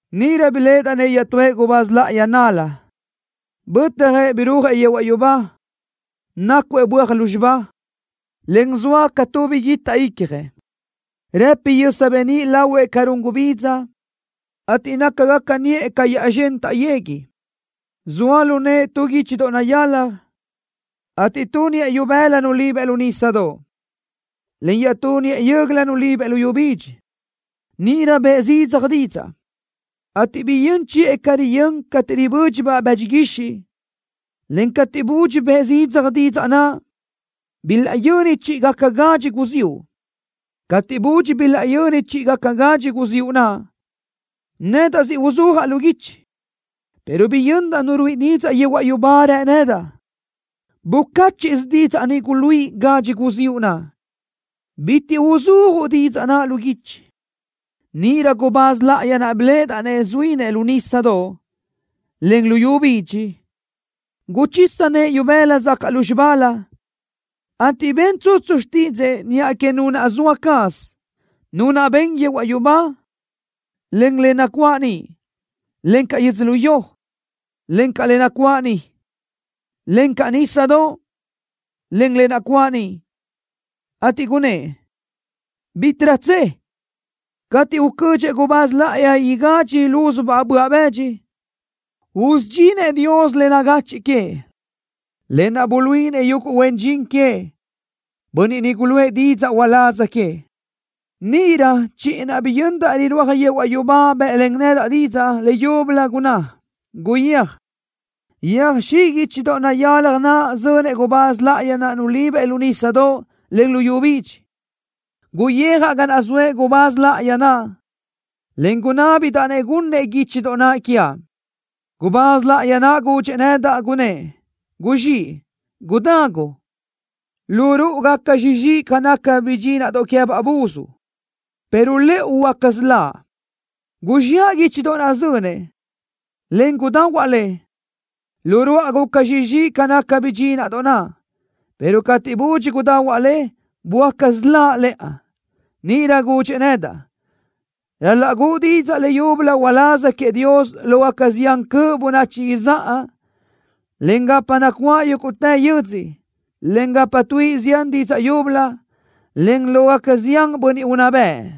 Níʼirö biléʼedaʼ-nëʼ iaʼtúëʼ gubáz láʼayi nál-la, bötjëʼ birúajëʼ yehuaʼ yubá, nácuëʼ böaj lúzxiba, en zoa ca tu biguitaʼ ícjalëʼ. Rëpi yösa beníʼ lahuëʼ ca run gubidza, ateʼ nácagaca niʼë ca yaʼzxö́n taʼyegui. Zoa lu nëʼë tu guíchidoʼ nayalaj, ateʼ tu niʼë ibëla nulibëʼ lu nísadoʼ, en iaʼtú niʼë yö́göla nulibëʼ luyú bidxi. Níʼirö bëʼë zidzaj didzaʼ, ateʼ biyö́n chiʼë ca riyö́n cateʼ ribö́dxiʼabaʼ bëdxi guixiʼ, en cateʼ budxi bëʼë zidzaj didzaʼ naʼ, bilaʼyöni chíʼigaca gadxi guziúʼ. Cateʼ budxi bilaʼyöni chíʼigaca guziúʼ naʼ, nedaʼ siʼ uzúajaʼ lu guichi, pero biyöndaʼ nu ruíʼi didzaʼ yehuaʼ yubá, rë nedaʼ: “Bucáchiʼsö didzaʼ ni guluíʼi gadxi guziúʼ naʼ. Bitiʼ uzúajuʼ didzaʼ naʼ lu guichi.” Níʼirö gubáz láʼayi naʼ biléʼedaʼ-nëʼ zuínëʼ lu nísadoʼ, en luyú bidxi, guchisa nëʼë ibëla zacaʼ lúzxibalö, ateʼ ben tsutsu xtídzëʼë niʼa que Nu naʼ zoa caz, Nu naʼ ben yehuaʼ yubá, en le nacuáʼ niʼ, encaʼ yödzölió, en le nacuáʼ niʼ, encaʼ nísadoʼ, en le nacuáʼ niʼ, ateʼ gunnë́ʼ: “¡Bítiʼrö tse! Cateʼ ucödxëʼ gubáz láʼayi igadxi lúzubaʼ böaʼ bëdxi, usudxinëʼ Dios le nagachiʼ queëʼ, lë naʼ buluíʼinëʼ yuguʼ huen dxin queëʼ, bönniʼ niʼ guluʼë didzaʼ uláz queëʼ.” Níʼirö chiʼi naʼ biyöndaʼ rirúaj yehuaʼ yubá bë́ʼlen nedaʼ didzaʼ leyúbölö. Gunná: “Guyéaj, yöjxíʼ guíchidoʼ nayalaj naʼ zönëʼ gubáz láʼayi naʼ nulibëʼ lu nísadoʼ, en luyú bidxi.” Guyijaʼ ga naʼ zoëʼ gubáz láʼayi naʼ, en gunábidaʼ-nëʼ gunnëʼ guíchidoʼ naʼ quiaʼ. Gubáz láʼayi naʼ gudxëʼ nedaʼ, gunnë́ʼ: “¡Guzxíʼ, gudagu! Lu ruʼu gaca zxixi ca naca bidxínaʼdoʼ queë́baʼ buz, pero lëʼu huöáca siláʼ.” Guzxiʼa guíchidoʼ naʼ zönëʼ, en gudahuaʼ le. Lu ruáʼa guca zxixi ca naca bidxínaʼdoʼ naʼ, pero cateʼ budxi gudahuaʼ le, böáca siláʼ lëʼa. Níʼirö gudxëʼ nedaʼ: “Ral-laʼ guʼu didzaʼ leyúbölö uláz queëʼ Dios lógaca zián cöʼ bönachi izáʼa, en gapa nacuáʼ yúguʼtë yödzö, en gapa tuíʼi zián didzaʼ yúbölö, en lógaca zián bönniʼ unná bëʼ.”